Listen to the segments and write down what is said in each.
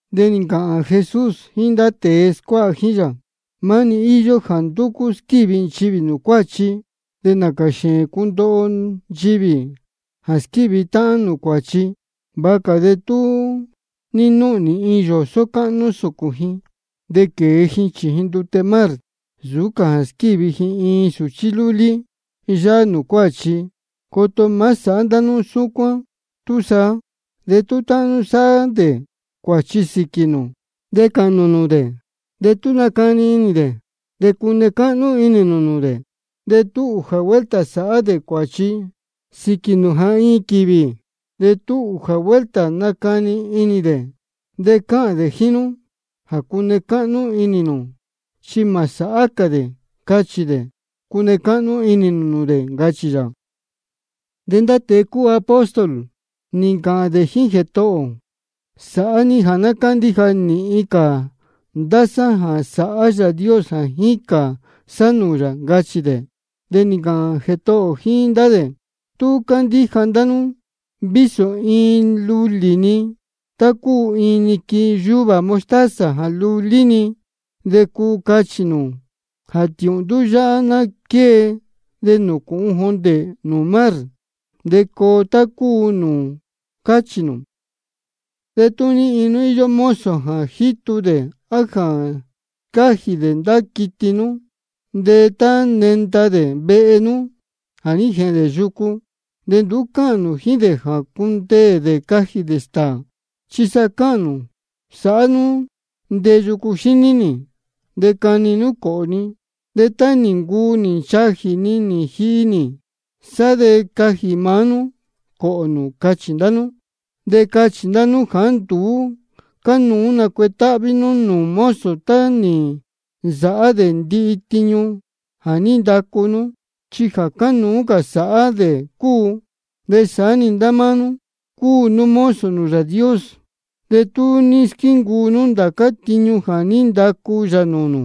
De nī ncāhān Jesús jíín ndá tēe scuáha jíín yā: Maá-ni íyó jā ndúcú squívi nchivī nūū cuāchi. De nācā xēēn cundoho nchivī jā squívi táhán nūū cuāchi. Vāha cā de tú ní núhnī iin yōsó cáhnú sūcūn ji, de quēe ji chījin ndute mar, nsūú cā jā squívi ji iin sūchí lúlí yáhá nūū cuáchi. Coto má sāhá ndá nú súcuán túsaá. De tú táhán nú sáhá dē cuāchi sīquī nū, de cāhān nū nūū dē. De tú nacani inī dē, de cune cáhnú inī nū nūū dē. De tú ūjā vuelta sáhá dē cuāchi sīquī nū jā iin quīvī, de tú ūjā vuelta nácani inī dē de cáhān dē jíín nú jā cune cáhnú inī nū chi mā sāhá cā dē, cáchī dē, de cánuú cune cáhnú inī nū nūū dē, ncachī yā. De ndá tēe cúu apóstol nī ncāhān dē jíín Jētohō ō: Sāhá ní jā ná cándíja nīhin cā ndá sá jā sāhá Yāā Dios jā jícān sá nūū yā, ncachī dē. De nī ncāhān Jētohō ō jíín ndá dē: Tú candíja ndá nú vísō iin lulī-ni, tá cúu iin niquin yuvā mostaza jā lulí-ni, de cuu cachī nū jā tiūhndú yáhá ná quée de nūcūhun jondē nūū mar, de coo tá cúu nūū cáchī nū. Tú ní iin nú íyó mozo jā jítu dē á jā scájī dē ndá quiti nú, de tá nenda dē vehe nú jā ní jēhēn dē yucu, de nduú cáhān nū jíín dē jā cundeē dē cajī dē stāā. Chi sa cáhān nū: Sāhá nú ndeyu cuxíní nī, de cani nú cōhō ni. De tá nī ncuu nī nchajī ni nī jihi nī, sá de cajī maá nú coho nú, cáchī ndá nú. De cáchī ndá nú jāá nduú cánuú nacuetáhví nú nūū mozo tá nī nsāhá dē tiñu jā ní ndacu nú, chi jā cánuú sāhá dē cúu. De saá-ni ndá máá nú, cúu nú mozo Yāā Dios. De tú nī squíncuu nú ndācá tiñu jā ní ndacu yā nūū nū,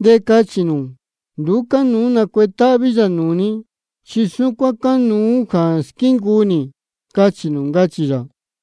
de cachī nū: Nduú cánuú nacuetáhví yā nūū ni, chi súcuán cánuú jā squíncuu nī, cachī nū, ncachī yā.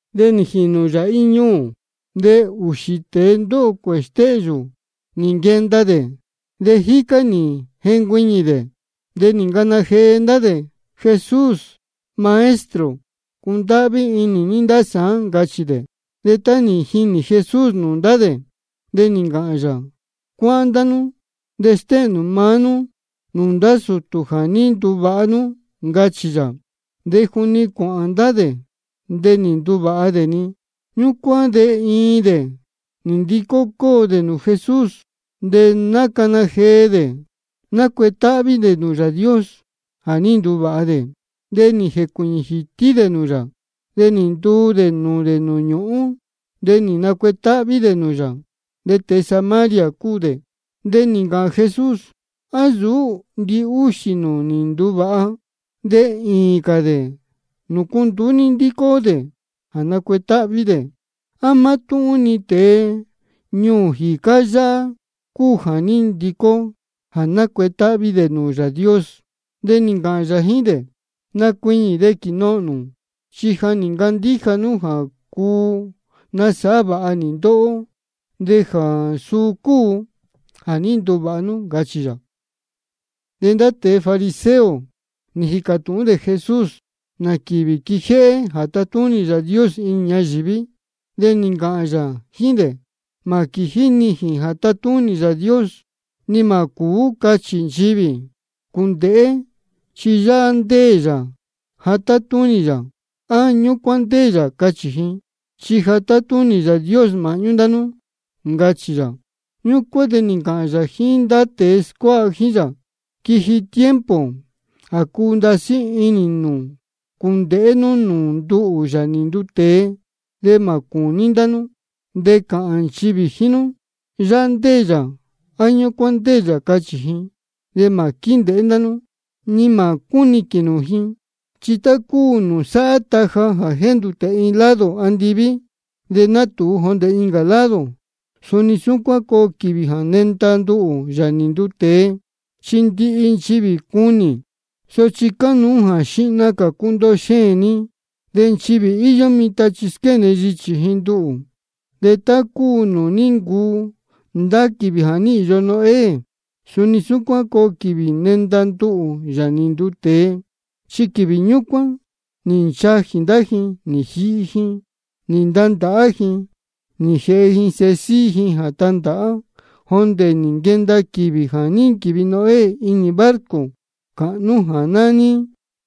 De nī jīnū yā iin ñuū, de ūxī tēe ndóho cuēhē stéhyū nī nquenda dē, de jícá nī jencuiñī dē. De nī ncana jee ndá dē: Jesús, Maestro, cundáhví inī ní ndá sāán, ncachī dē. De tá nī jinī Jesús nūū ndá dē, de nī ncāhān yā: Cuáhán ndá nú de stéhēn nū maá nú nūū ndá sūtū jā ní nduvāha nú, ncachī yā. De juni cuāhān ndá dē de nī nduvāha dē-ni. Ñúcuán de iin dē nī ndicó cóo dē nūū Jesús, de nácana jee dē, nácuetáhví dē nūū Yāā Dios jā ní nduvāha dē. De nī jēcuīñī jītí dē nūū yā, de nī ntuu dē nūū dē nūū ñūhún, de nī nacuetáhví dē nūū yā. De tēe Samaria cúu dē. De nī ncāhān Jesús: ¿A nsūú ndihúxī dē nī nduvāha? De īīn cā dē, ¿nūcu nduú ní ndícó dē jā nacuetáhví dē? ¿A mátúhún-ni tēe ñuū jīcá yáhá cúu jā ní ndicó jā nacuetáhví dē nūū Yāā Dios? De nī ncāhān yā jíín dē: Nacuiñī de quīnohōn nū. Chi nī ncandíja nú jā cuu nasāhá vāha nī ndóhó, de jā suu cúu jā ní nduvāha nú, ncachī yā. De ndá tēe fariseo nī jīcā tūhún dē Jesús nā quīvī quijéhé jā tatúnī Yāā Dios inī ñayīví. De nī ncāhān yā jíín dē: Mā quījí nijīn jā tatúnī Yāā Dios. Ni mā cūú cachī nchivī: Cūndēhé chi yáhá ndéē yā jā tátúnī yā, á: Ñúcuán ndéē yā, cachī ji. Chi ja tátúnī Yāā Dios māhñú ndá nú, ncachī yā. Ñúcuán de nī ncāhān yā jíín ndá tēe scuáha jíín yā: Quiji tiempo jā cuu ndasí inī nū cūndēhé nú nūū nduhū, Yāā nī nduu tēe, de mā cūní ndá nú. De cāhān nchivī jíín nú: Yáhá ndéē yā, á: Ñúcuán ndéē yā, cachī ji. De mā quíndēhé ndá nú, ni mā cúniquīn nū ji. Chi tá cúu nūū sáhá taja jā jéndūtē iin lado andiví de nátūu jondē incā lado, de suni súcuán coo quīvī jā nenda nduhū, Yāā nī nduu tēe, chi ndihi nchivī cunī. Sochi cánuú jā xihna cā cundoho xēēn ni, de nchivī íyó mitan chi squéne yichī ji nduhū. De tá cúu nūū ní ncuu ndá quīvī jā ní īyo Noé, suni súcuán coo quīvī nenda nduhū, Yāā nī nduu tēe. Chi quīvī ñúcuán nī nchajī ndá ji, nī jihi ji, nī ntandāhá ji, nī jēhe ji sēhe síhí ji jā tandāhá, jondē nī nquenda quīvī jā ní nquīvi Noé inī barco cāhnú jā nání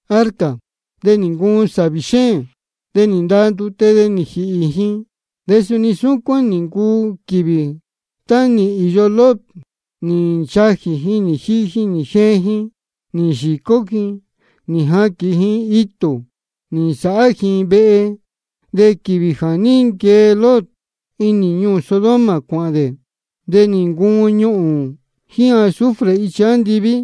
arca. De nī ncuun sāvī xéēn, de nī ndaa ndute de nī jīhī ji. De suni súcuán nī ncuu quīvī tá nī īyo Lot. Nī nchajī ji, nī jihi ji, nī jeen ji, nī yīcó ji, nī jaquīn ji itū, nī nsāhá ji vehe. De quīvī jā ní nquee Lot inī ñuū Sodoma cuāhān dē, de nī ncuun ñuhūn jíín azufre ichi andiví,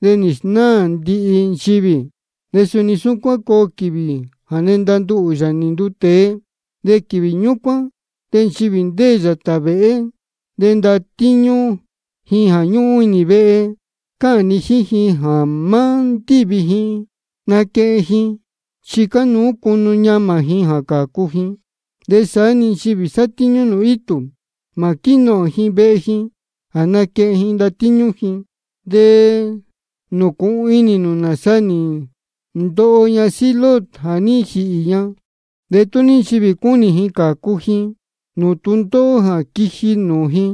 de nī snáā ndihi nchivī. De suni súcuán coo quīvī jā nenda nduhū, Yāā nī nduu tēe. De quīvī ñúcuán de nchivī ndéē yātā vēhé, de ndatíñú ji ñúhún inī vehe, cáhān ni jíín ji jā má ndívi ji naquehen ji, chi cánuú cunu ñamā ji jā cācu ji. De saá-ni nchivī satíñú nūū itū, mā quínohōn ji vehe ji jā naquehen ji ndatíñú ji. De nūcūhun inī nū nāsa nī ndoho ñasíhí Lot jā ní jīhī ña. De tú ní nchivī cúnī ji cācu ji nūū tūndóhó jā quiji nūū ji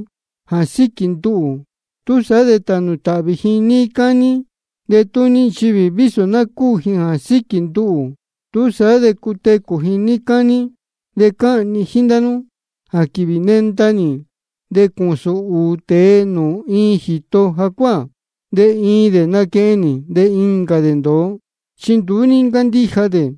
jā síquī nduhū, túsaá de tānū tāhvī ji níí cání. De tú ní nchivī vísō ná cúū ji jā síquī nduhū, túsaá de cutecū ji níí cání. De cáhān ni jíín ndá nú jā quīvī nenda nī de cūsūn ūū tēe nūū iin jīto jacuáā, de iin dē naquehen nī, de incā dē ndōo, chi nduú ní ncándíja dē.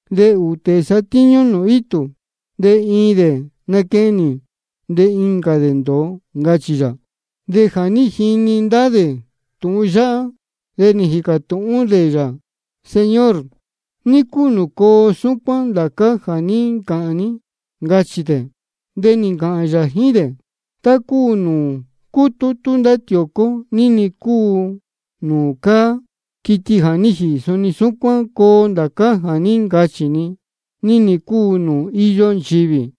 De ūū tēe satíñú dē nūū itū, de iin dē naquehen nī, de incā dē ndōo, ncachī yā. De jā ní jini ndá dē tūhun yáhá, de nī jīcā tūhún dē yā: Señor, ¿ní cúu nūū coo súcuán ndācá jā ní ncāhān ní? ncachī dē. De nī ncāhān yā jíín dē: Tá cúu nūū cútútú ndá tiōcó ní-ni cúu nūū cáá quiti jā ní jīhī, suni súcuán coo ndācá jā ní ncāhān ni, ní-ni cúu nūū íyó nchivī.